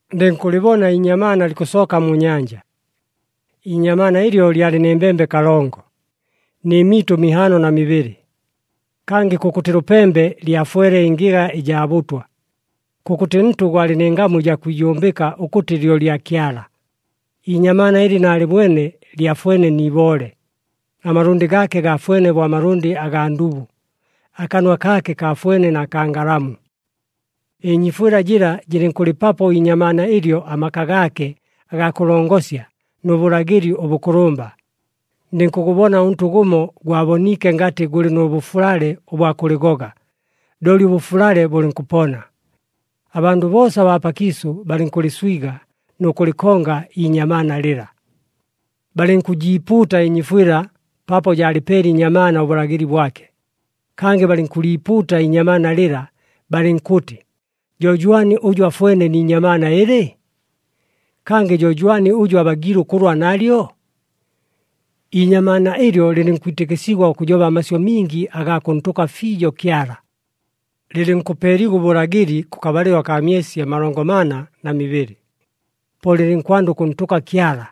Ndɨnkʉlɨbona iinyamaana likʉsooka mu nyanja. Iinyamaana ɨlyo lyalɨ nɨ mbembe kalongo, nɨ mitʉ mihaano na mibɨlɨ. Kangɨ kʉkʉtɨ lʉpembe lyafwele ɨngɨga ɨjaa bʉtwa. Kʉkʉtɨ ntʉ gwalɨ nɨ ngamu ɨjaa kwijumbɨka ʉkʉtɨ lyo lya Kyala. Iinyamaana ɨlɨ naalɨbwene lyafwene ni iboole, amalʉndɨ gaake gaafwene bo amalʉndɨ agaa ndubu, akanwa kaake kaafwene na kaa ngalamu. Ɨnyiifwɨla jɨla jɨlɨnkʉlɨpapo iinyamaana ɨlyo amaka gaake agaa kʉlongosya nʉ bʉlagɨli ʉbʉkʉlʉmba. Ndɨnkʉgʉbona ʉntʉ gʉmo gwaboniike ngatɨ gʉlɨ nʉ bʉfulale ʉbwa kʉlɨgoga, looli ʉbʉfulale bʉlɨnkʉpona. Abandʉ boosa abaa pakiisʉ balɨnkʉlɨswiga nʉ kʉlɨkonga iinyamaana lɨla. Balɨnkʉjiipuuta ɨnyiifwɨla, paapo jaalɨpeele iinyamaana ʉbʉlagɨli bwake. Kangɨ balɨnkʉliipuuta iinyamaana lɨla, balɨnkʉtɨ, “Jo jwani ʉjʉ afwene ni inyamaana ɨlɨ? Kangɨ jo jwani ʉjʉ abagiile ʉkʉlwa nalyo?” Iinyamaana ɨlyo lɨlɨnkwitɨkɨsigwa ʉkʉjoba amasyʉ mingi agaa kʉntʉka fiijo Kyala. Lɨlɨnkʉpeeligwa ʉbʉlagɨli kʉkabalɨlo akaa myesi amalongo mana na mibɨlɨ. Po lɨlɨnkwanda ʉkʉntʉka Kyala,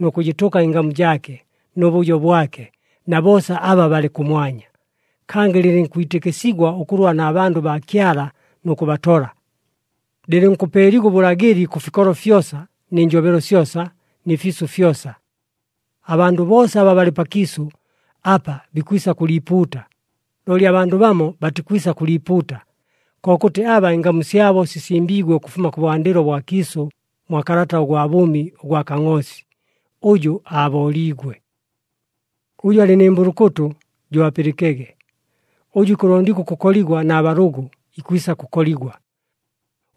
nʉ kʉjɨtʉka ɨngamu jaake, nʉ bʉjo bwake, na boosa aba balɨ kʉmwanya. Kangɨ lɨlɨnkwitɨkɨsigwa ʉkʉlwa na bandʉ baa Kyala nʉ kʉbatola. Lɨlɨnkʉpeeligwa ʉbʉlagɨli kʉ fikolo fyosa, nɨ njobelo syosa, nɨ fiisʉ fyosa. Abandʉ boosa aba balɨ pakiisʉ apa bikwisa kʉliipuuta, looli abandʉ bamo batikwisa kʉliipuuta, kokʉtɨ aba ɨngamu syabo sisimbiigwe ʉkʉfuma kʉbwandɨlo bwa kiisʉ mwa kalata ʉgwa bʉʉmi ʉgwa Kangʼoosi, ʉjʉ aabooliigwe. Ʉjʉ alɨ nɨ mbʉlʉkʉtʉ, jo apɨlɨkege. Ʉjʉ ikʉlondigwa ʉkʉkoligwa na balʉgʉ, ikwisa kʉkoligwa.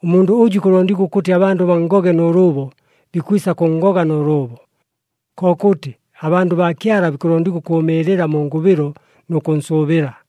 Ʉmundʉ ʉjʉ ikʉlondigwa ʉkʉtɨ abandʉ banngoge nʉ lʉʉbo, bikwisa kʉnngoga nʉ lʉʉbo. Kokʉtɨ, abandʉ baa Kyala bikʉlondigwa ʉkʉʉmɨɨlɨla mu ngʉbɨlo nʉ kʉnsʉʉbɨla.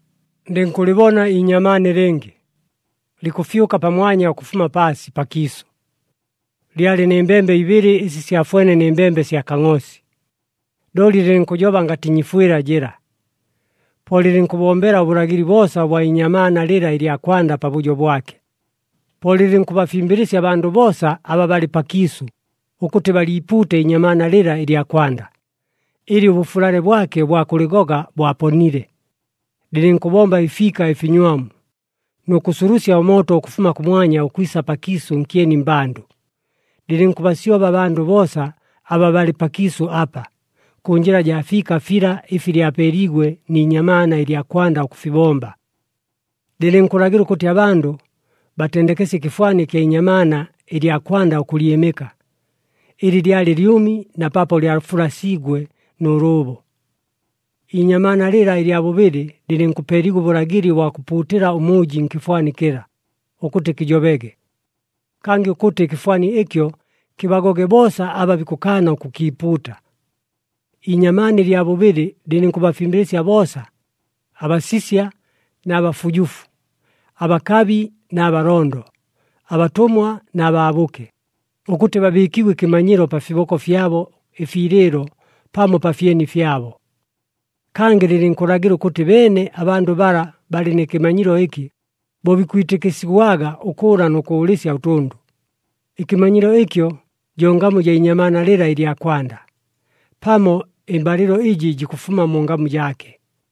Ndɨnkʉlɨbona iinyamaana ɨlɨngɨ, likʉfyʉka pamwanya ʉkʉfuma paasi pakiisʉ. Lyalɨ nɨ mbembe ibɨlɨ ɨsi syafwene nɨ mbembe sya kangʼoosi, looli lɨlɨnkʉjoba ngatɨ nyiifwɨla jɨla. Po lɨlɨnkʉbombela ʉbʉlagɨli boosa ʉbwa inyamaana lɨla ɨlya kwanda pabʉjo bwake. Po lɨlɨnkʉbafimbɨlɨsya abandʉ boosa aba balɨ pakiisʉ ʉkʉtɨ baliipuute iinyamaana lɨla ɨlya kwanda, ɨlɨ ʉbʉfulale bwake ʉbwa kʉlɨgoga bwaponile. Lɨlɨnkʉbomba ɨfiika ɨfinywamu, nʉ kʉsulusya ʉmooto ʉkʉfuma kʉmwanya ʉkwisa pakiisʉ nkyeni mmbandʉ. Lɨlɨnkʉbasyoba abandʉ boosa aba balɨ pakiisʉ apa, kʉ njɨla jaa fiika fila ɨfi lyapeeliigwe ni inyamaana ɨlya kwanda ʉkʉfibomba. Lɨlɨnkʉlagɨla ʉkʉtɨ abandʉ batendekesye ɨkɨfwani ɨkya inyamaana ɨlya kwanda ʉkʉlyɨmɨka, ɨlɨ lyalɨ lyʉmi na paapo lyafulasiigwe nʉ lʉʉbo. Iinyamaana lɨla ɨlya bʉbɨlɨ lɨlɨnkʉpeeligwa ʉbʉlagɨli ʉbwa kʉpuutɨla ʉmʉʉji nkɨfwani kɨla, ʉkʉtɨ kɨjobege. Kangɨ ʉkʉtɨ ɨkɨfwani ɨkyo kɨbagoge boosa aba bikʉkaana ʉkʉkiipuuta. Iinyamaana ɨlya bʉbɨlɨ lɨlɨnkʉbafimbɨlɨsya boosa, abasisya na bafujufu, abakabi na balondo, abatʉmwa na baabʉke, ʉkʉtɨ babɨɨkigwe ɨkɨmanyilo pa fiboko fyabo ɨfiilɨɨlo pamo pa fyeni fyabo. Kangɨ, lɨlɨnkʉlagɨla ʉkʉtɨ beene abandʉ bala balɨ nɨ kɨmanyilo ɨkɨ, bo bikwitɨkɨsigwaga ʉkʉʉla nʉ kʉʉlɨsya ʉtʉndʉ. Ɨkɨmanyilo ɨkyo jo ngamu jaa inyamaana lɨla ɨlya kwanda, pamo ɨmbalɨlo ɨjɨ jikʉfuma mu ngamu jaake.